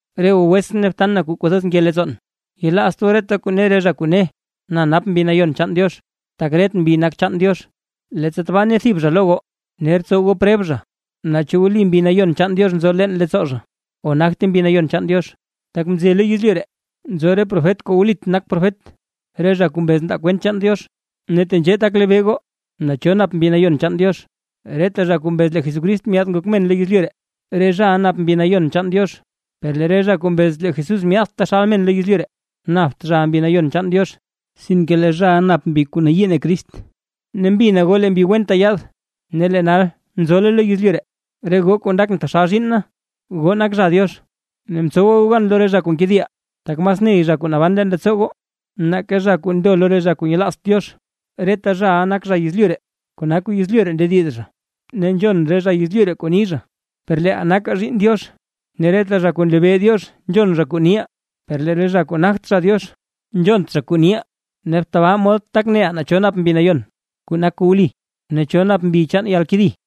Re goo wetsʼn ne btan na kuu kwathoz nke leettsoon, yelaazt goo reta kuu ne re zha kuu ne: “Na nap Mbi Nayon chaan Diox”, tak ret mbi nak chaan Diox. Leettsa tabaa ne thib zha lo goo, ner btsow goo preb zha naa chu wli Mbi Nayon chaan Diox nzo leen leettsoo zha o nagte Mbi Nayon chaan Diox. Tak mze lo yezlyu ree nzo re profet kuu wlit nak profet, re zha kuu mbez ndaa kwent chaan Diox. Ne tenzhee tak lebee goo naa cho nap Mbi Nayon chaan Diox: Reta zha kuu mbez lee Jesucrist myaad ngok men lo yezlyu ree, re zhaʼa nap Mbi Nayon chaan Diox. Per lee re zha kuu mbez lee Jesús myaadt taxal men lo yezlyu ree, napt zhaʼa Mbi Nayon chaan Diox, sinke lee zhaʼa nap mbi kuu nayii ne Crist. Ne mbina goo lee mbi wenta yaad; ne lee nal nzole lo yezlyu ree. Re goo kuu ndakʼn taxal zhiinn na, goo nak zha Diox, ne mtsowa goo gan lo re zha kuu nkediʼa; tak mas ney zha kuu naban leen leettsoo goo, nake zha kuu ndo lo re zha kuu nyelaazt Diox. Reta zhaʼa nak zha yezlyu ree, kona kuu yezlyu ree ndediz zha ne nzhon re zha yezlyu ree kuu ni zha. Per leeʼaa nakaa zhiinn Diox. Ne reta zha kuu nlebee Diox nzhon zha kuu niʼaa; per lee zha kuu nagt zha Diox, nzhont zha kuu niʼaa. Ne tabaa mod tak neʼaa naa cho nap Mbi Nayon kuu nak kuu wli, ne cho nap mbi chaan yalkedi.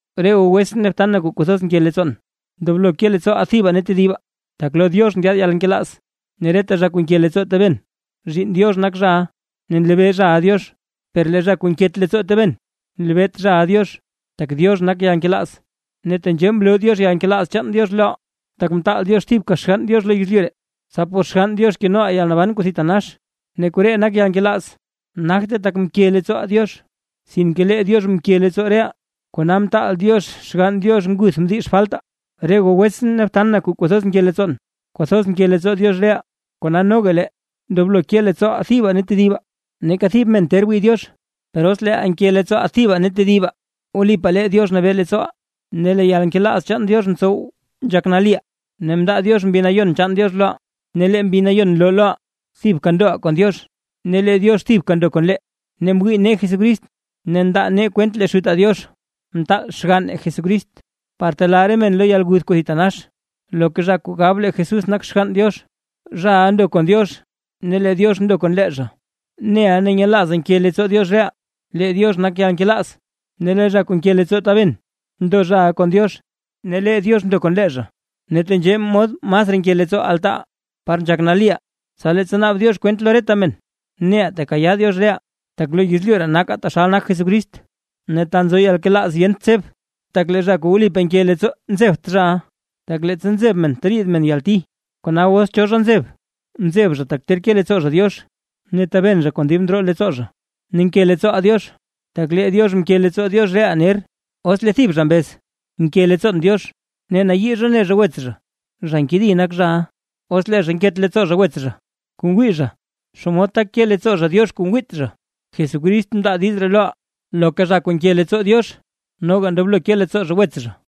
Re goo wetsʼn ne btan na kuu kwathoz nke leettsoon, ndoblo ke leettsooʼaa thibaa ne tedibaa, tak lo Diox ndyaad yalnkelaaz. Ne reta zha kuu nke leettsoo taben, zhiinn Diox nak zhaʼa ne nlebee zhaʼa Diox. Per lee zha kuu nket leettsoo taben, nlebeet zhaʼa Diox, tak Diox nak yalnkelaaz. Ne tenzhee mloo Diox yalnkelaaz chaan Diox loʼaa, tak mtaal Diox thibka Xgann Diox lo yezlyu ree, tsa por Xgann Diox kenoʼaa yalnaban kuu thitanax. Ne koree nak yalnkelaaz: Nagte tak mke leettsooʼaa Diox, sinke lee Diox mke leettsoo reʼaa, kona mtaal Diox Xgann Diox nguth mdix faltaa. Re goo wetsʼn ne btan na kuu kwathoz nke leettsoon, kwathoz mke leettsoo Diox reʼaa, kona noga lee ndoblo ke leettsooʼaa thibaa ne tedibaa. Neeka thib men ter wii Diox; per os leeʼaa nke leettsooʼaa thibaa ne tedibaa, wlipaa lee Diox nabee leettsooʼaa ne lee yalnkelaaz chaan Diox ntsow nzhak naliʼaa. Ne mndaa Diox Mbi Nayon chaan Diox loʼaa, ne lee Mbi Nayon nloo loʼaa thibka ndoʼaa kon Diox ne lee Diox thibka ndo kon lee. Ne mwii nee Jesucrist ne ndaa nee kwent lee Xutaa Diox mtaal xgann Jesucrist, par telaa re men lo yalguth kuu thitanax. Loka zha kuu gab lee Jesús nak Xgann Diox, zhaʼa ndo kon Diox ne lee Diox ndo kon lee zha. Neʼaa ne nyelaazaa nke leettsoo Diox reʼaa. Lee Diox nak yalnkelaaz; ne lee zha kuu nke leettsoo taben ndo zhaʼa kon Diox ne lee Diox ndo kon lee zha. Ne tenzhee mod masraa nke leettsoo altaaʼaa par nzhak naliʼaa, tsa leettsa naab Diox kwent lo reta men neʼaa tekayaa Diox reʼaa; tak lo yezlyu ree nakaa taxal nak Jesucrist. Ne ta nzo yalnkelaaz yent tseb. Tak lee zha kuu wlipaa nke leettsoo nzebt zhaʼa, tak leettsa nzeb men teriid men yalti. Kona os cho zha nzeb, nzeb zha tak ter ke leettsoo zha Diox ne taben zha kon dib ndroo leettsoo zha. Ne nke leettsooʼaa Diox, tak lee Diox mke leettsoo Diox reʼaa ner. Os lee thib zha mbez: “Nke leettsoon Diox”, ne nayii zha ne zha wets zha, zha nkedi nak zhaʼa. Os lee zha nket leettsoo zha wets zha, kuu ngwii zha, ¿xomod tak ke leettsoo zha Diox kuu ngwiit zha? Jesucrist mndaa diiz ree loʼaa; loka zha kuu nke leettsoo Diox, noga ndoblo ke leettsoo zha wets zha.